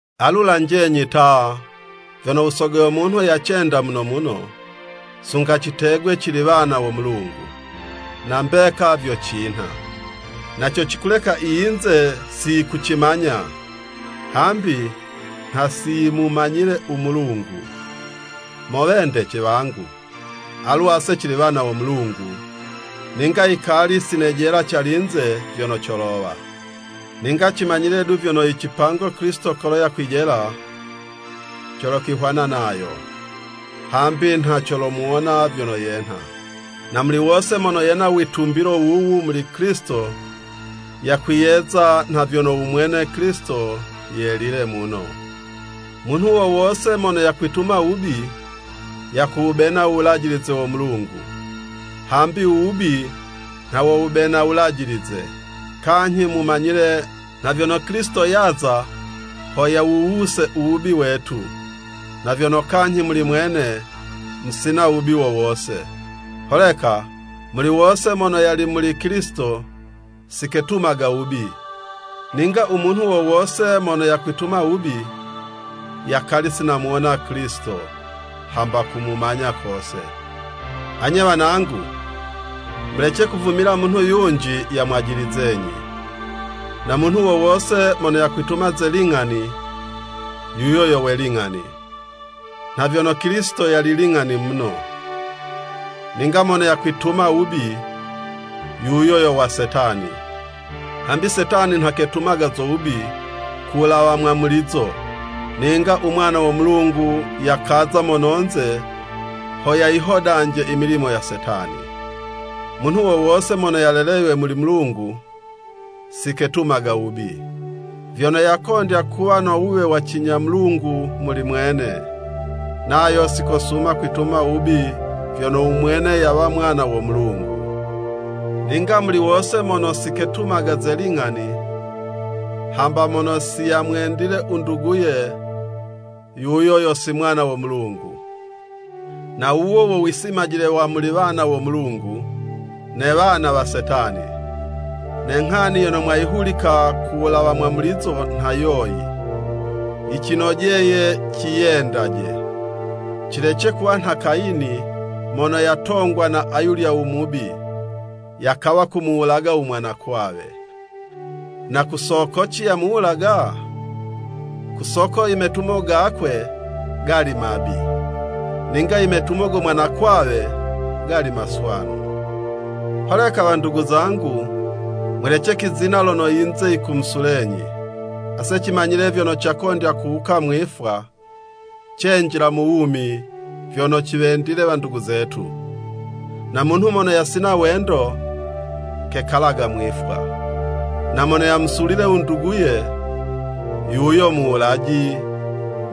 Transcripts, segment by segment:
Alu lanjenyi ta, vyono u Sogo yo munhu yacenda muno muno, sunga citegwe cili wana wo Mulungu! Na mbeka vyo cinha. Na co cikuleka i yinze siyikucimanya, hambi nha si yimumanyile u Mulungu. Mo wendece wangu, alu ase cili wana wo Mulungu, ninga yikali sinejela calinze vyono colowa. Ninga cimanyile du vyono i cipango Kilisito kolo yakwijela, colokwihwana nayo, hambi nha colomuwona vyono yenha. Na muli wose mono yena u witumbilo wuwu muli Kilisito yakwiyeza, nha vyono u mwene Kilisito yelile muno. Munhu wo wose mono yakwituma wubi, yakuwubena u wulajilize wo Mulungu, hambi u wubi nha wo wubena u wulajilize. Kanyhi mumanyile nha vyono Kilisito yaza ho yawuwuse u wubi wetu, na vyono, kanyhi muli mwene musina wubi wo wose. Holeka muli wose mono yali muli Kilisito, siketumaga wubi, ninga u munhu wo wose mono yakwituma wubi, yakali si namuwona Kilisito, hamba kumumanya kose. Anye wanangu, mulece kuvumila munhu yunji yamwajilizenyi. Na munhu wo wose mono yakwituma ze ling'ani, yuyo yo we ling'ani nha vyono Kilisito yali ling'ani muno. Ninga mono yakwituma wubi, yuyo yo wa Setani, hambi Setani nha ketumaga zo wubi ku wulawa mwamulizo. Ninga u Mwana wo Mulungu yakaza mononze ho yayihodanje i milimo ya Setani. Munhu wo wose mono yaleleywe muli Mulungu, siketumaga wubi, vyono yakondya kuwa no wuwe wa cinya Mulungu muli mwene, nayo sikosuma kwituma wubi vyono u mwene yawa mwana wo Mulungu. Ninga muli wose mono siketumaga ze ling'ani, hamba mono siyamwendile u nduguye, yuyo yo si mwana wo Mulungu. Na wuwo wo wisimajile wa muli wana wo Mulungu ne wana wa Setani. Ne nghani yono mwayihulika ku wulawa mwamulizo nha yoyi. Yicinojeye ciyendaje! Cilece kuwa nha Kayini mono yatongwa na ayulya u Mubi, yakawa kumuwulaga u mwanakwawe. Na ku sokoci yamuwulaga? Ku soko i metumo gakwe gali mabi, ninga i metumo go mwanakwawe gali maswanu! Holeka wandugu zangu, mulece kwizina lono i yinze yikumusulenyi. Ase cimanyile vyono cakondya kuwuka mwifwa, cenjila mu wumi vyono ciwendile wandugu zetu. No munhu mono yasina wendo, kekalaga mwifwa. Na mono yamusulile u nduguye, yuyo muwulaji,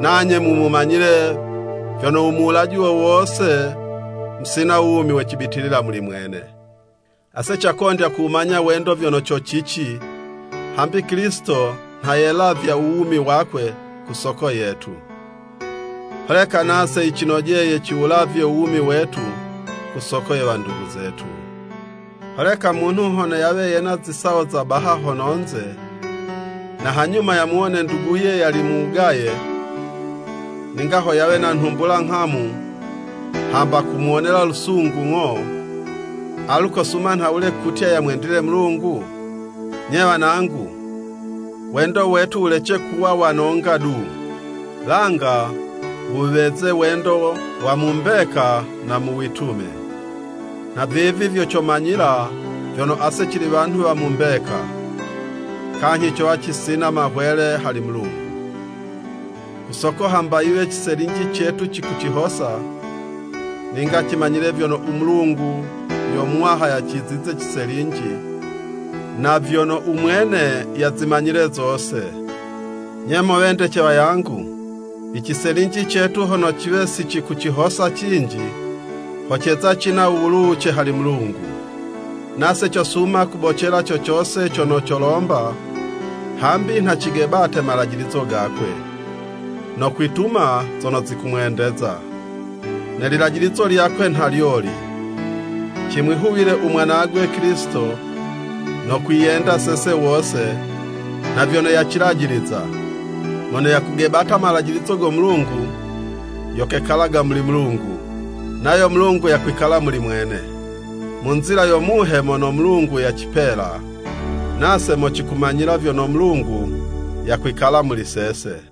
nanye mumanyile vyono u muwulaji wo wose, musina wumi we cibitilila muli mwene. Ase cakondya kuwumanya wendo vyono co cici, hambi Kilisito nha yelavya u wumi wakwe ku soko yetu. Holeka nase yicinojeye ciwulavye u wumi wetu ku soko ye wandugu zetu. Holeka munhu hono yawe yena zisawo za baha mononze, na hanyuma yamuwone nduguye yali mu wugaye, ninga ho yawe na nhumbula nghamu hamba kumuwonela lusungu ng'o, alu kosuma nhawule kutya yamwendile Mulungu? Nye wanangu, wendo wetu wulece kuwa wa nonga du, langa wuweze wendo wa mu mbeka na mu witume. Nhavivi vyo comanyila vyono ase cili wanhu wa mu mbeka, kanyhi cowa cisina mahwele hali Mulungu. Ku soko hamba yiwe ciselinji cetu cikucihosa, ninga cimanyile vyono u Mulungu yo muwaha yacizize ciselinji, na vyono u mwene yazimanyile zose. Nye mo wendece wangu, i ciselinji cetu hono ciwe sicikucihosa cinji, ho ceza cina u wuluwuce hali Mulungu, nase cosuma kubocela co cose cono colomba, hambi nha cigebate malajilizo gakwe, no kwituma zono zikumwendeza. Ne lilajilizo lyakwe nha lyoli, Cimwihuwile u Mwanagwe Kilisito, no kwiyenda sese wose, nha vyono yacilajiliza. Mono yakugebata malajilizo go Mulungu, yo kekalaga muli Mulungu, nayo Mulungu yakwikala muli mwene. Mu nzila yo Muhe mono Mulungu yacipela, nase mo cikumanyila vyono Mulungu yakwikala muli sese.